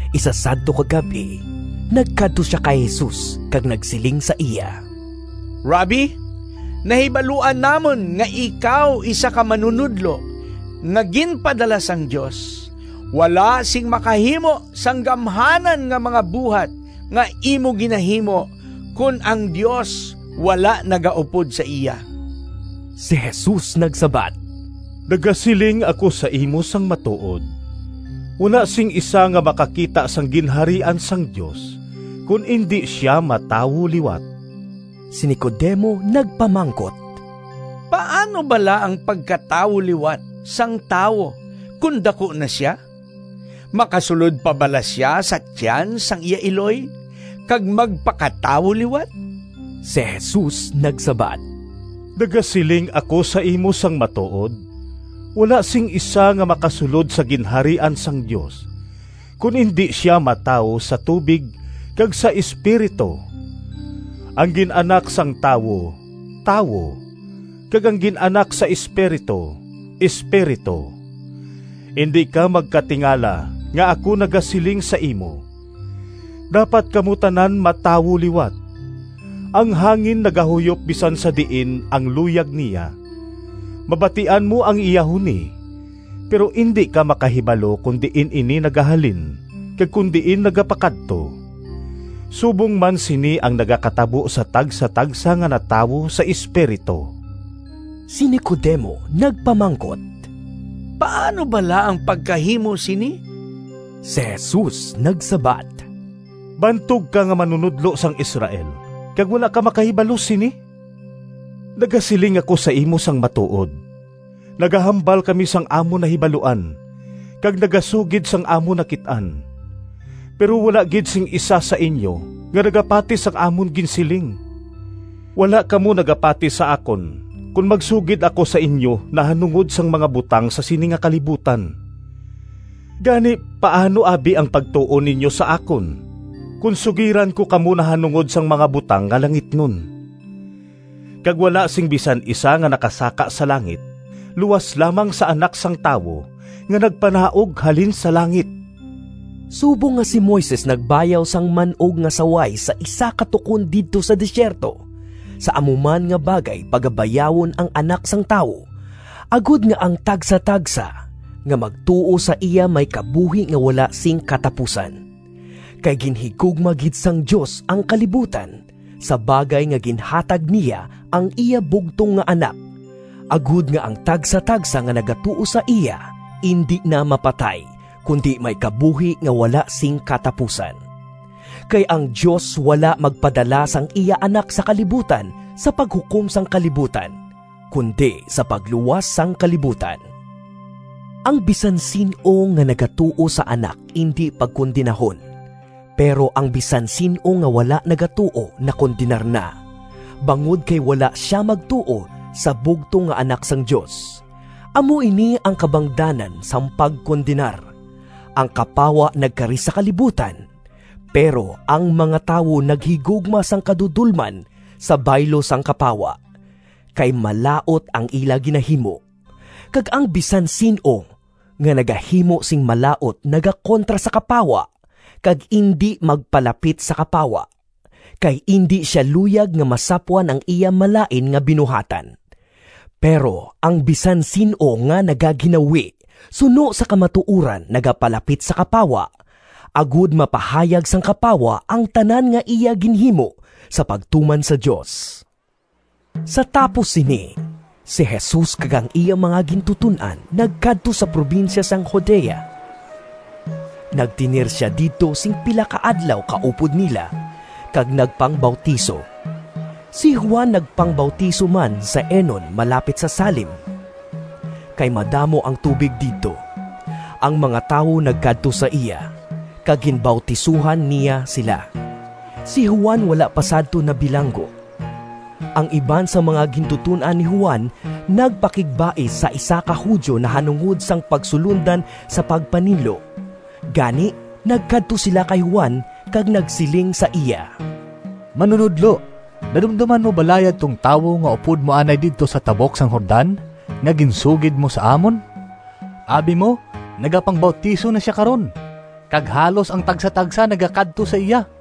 Isa sadto ka gab-i, nagkadto sia kay Jesus kag nagsiling sa iya, “Rabbi, nahibaluan namon nga ikaw isa ka manunodlo nga ginpadala sang Dios. Wala sing makahimo sang gamhanan nga mga buhat nga imo ginahimo kon ang Dios wala nagaupod sa iya.” Si Jesus nagsabat, “Nagasiling ako sa imo sang matuod: wala sing isa nga makakita sang Ginharian sang Dios kon indi sia matawo liwat.” Si Nicodemo nagpamangkot, “Paano bala ang pagkatawo liwat sang tawo kon daku na sia? Makasulod pa bala sia sa tiyan sang iya iloy kag magpakatawo liwat?” Si Jesus nagsabat, “Nagasiling ako sa imo sang matuod: wala sing isa nga makasulod sa Ginharian sang Dios, kon indi sia matawo sa tubig kag sa Espiritu. Ang gin-anak sang tawo, tawo, kag ang gin-anak sa Espiritu, espiritu. Indi ka magkatingala nga ako nagasiling sa imo, ‘Dapat kamo tanan matawo liwat.’ Ang hangin nagahuyop bisan sa diin ang luyag niya. Mabatian mo ang iya huni, pero indi ka makahibalo kon diin ini nagahalin kag kon diin nagapakadto. Subong man sini ang nagakatabo sa tagsatagsa nga natawo sa Espiritu.” Si Nicodemo nagpamangkot, “Paano bala ang pagkahimo sini?” Si Jesus nagsabat, “Bantog ka nga manunodlo sang Israel, kag wala ka makahibalo sini? Nagasiling ako sa imo sang matuod: nagahambal kami sang amon nahibaluan, kag nagasugid sang amon nakit-an, pero wala gid sing isa sa inyo nga nagapati sang amon ginsiling. Wala kamo nagapati sa akon kon magsugid ako sa inyo nahanungod sang mga butang sa sini nga kalibutan. Gani, paano abi ang pagtuo ninyo sa akon, kon sugiran ko kamo nahanungod sang mga butang nga langitnon? Kag wala sing bisan isa nga nakasaka sa langit luas lamang sa Anak sang Tawo nga nagpanaog halin sa langit.” Subong nga si Moises nagbayaw sang man-og nga saway sa isa ka tukon didto sa desierto, sa amo man nga bagay pagabayawon ang Anak sang Tawo, agod nga ang tagsatagsa nga magtuo sa iya may kabuhi nga wala sing katapusan. Kay ginhigugma gid sang Dios ang kalibutan sa bagay nga ginhatag niya ang iya bugtong nga Anak, agod nga ang tagsatagsa nga nagatuo sa iya indi na mapatay, kundi may kabuhi nga wala sing katapusan. Kay ang Dios wala magpadala sang iya Anak sa kalibutan sa paghukom sang kalibutan, kundi sa pagluwas sang kalibutan. Ang bisan sin-o nga nagatuo sa Anak indi pagkondenahon, pero ang bisan sin-o nga wala nagatuo nakondenar na, bangod kay wala sia magtuo sa bugtong nga Anak sang Dios. Amo ini ang kabangdanan sang pagkondenar: ang kapawa nagkari sa kalibutan, pero ang mga tawo naghigugma sang kadudolman sa baylo sang kapawa, kay malaut ang ila ginahimo. Kag ang bisan sin-o nga nagahimo sing malaut nagakontra sa kapawa kag indi magpalapit sa kapawa, kay indi sia luyag nga masapwan ang iya malain nga binuhatan. Pero ang bisan sin-o nga nagaginawi suno sa kamatuoran nagapalapit sa kapawa, agod mapahayag sang kapawa ang tanan nga iya ginhimo sa pagtuman sa Dios. Sa tapos sini, si Jesus kag ang iya mga gintuton-an nagkadto sa probinsya sang Judea. Nagtener sia didto sing pila ka adlaw kaupod nila, kag nagpangbautiso. Si Juan nagpangbautiso man sa Enon malapit sa Salim, kay madamo ang tubig didto. Ang mga tawo nagkadto sa iya, kag ginbautisohan niya sila. (Si Juan wala pa sadto nabilanggo.) Ang iban sang mga gintuton-an ni Juan nagpakigbais sa isa ka Judio nahanungod sang pagsulondan sa pagpaninlo. Gani, nagkadto sila kay Juan kag nagsiling sa iya, “Manunodlo, nadumdoman mo bala yadtong tawo nga upod mo anay didto sa tabok sang Jordan nga ginsugid mo sa amon? Abi mo nagapangbautiso na sia karon, kag halos ang tagsatagsa nagakadto sa iya!”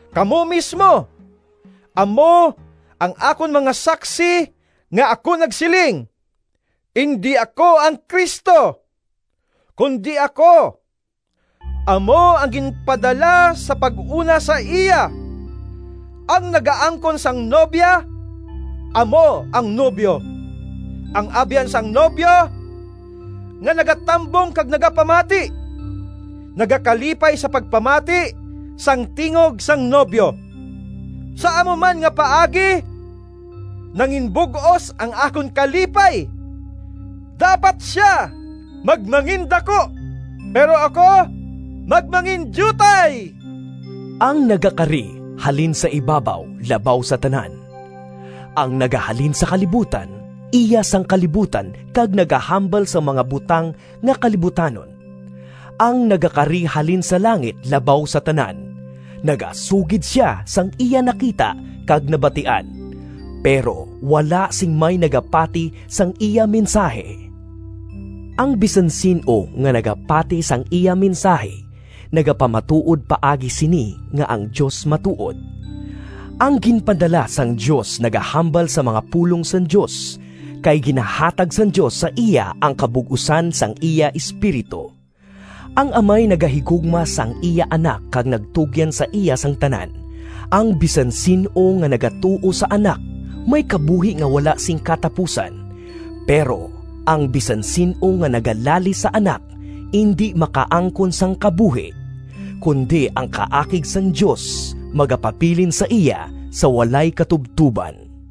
Kamo mismo amo ang akon mga saksi nga ako nagsiling, ‘Indi ako ang Cristo, kundi ako amo ang ginpadala sa pag-una sa iya.’ Ang nagaangkon sang nobya amo ang nobyo; ang abyan sang nobyo nga nagatambong kag nagapamati, nagakalipay sa pagpamati sang tingog sang nobyo. Sa amo man nga paagi, nanginbug-os ang akon kalipay. Dapat sia magmangindaku, pero ako magmangindiutay.” Ang nagakari halin sa ibabaw labaw sa tanan; ang nagahalin sa kalibutan, iya sang kalibutan kag nagahambal sang mga butang nga kalibutanon. Ang nagakari halin sa langit labaw sa tanan. Nagasugid sia sang iya nakita kag nabatian, pero wala sing may nagapati sang iya mensahi. Ang bisan sin-o nga nagapati sang iya mensahi nagapamatuod paagi sini nga ang Dios matuod. Ang ginpadala sang Dios nagahambal sang mga pulong sang Dios, kay ginahatag sang Dios sa iya ang kabug-osan sang iya Espiritu. Ang Amay nagahigugma sang iya Anak kag nagtugyan sa iya sang tanan. Ang bisan sin-o nga nagatuo sa Anak may kabuhi nga wala sing katapusan, pero ang bisan sin-o nga nagalalis sa Anak indi makaangkon sang kabuhi, kundi ang kaakig sang Dios magapabilin sa iya sa walay katubtoban.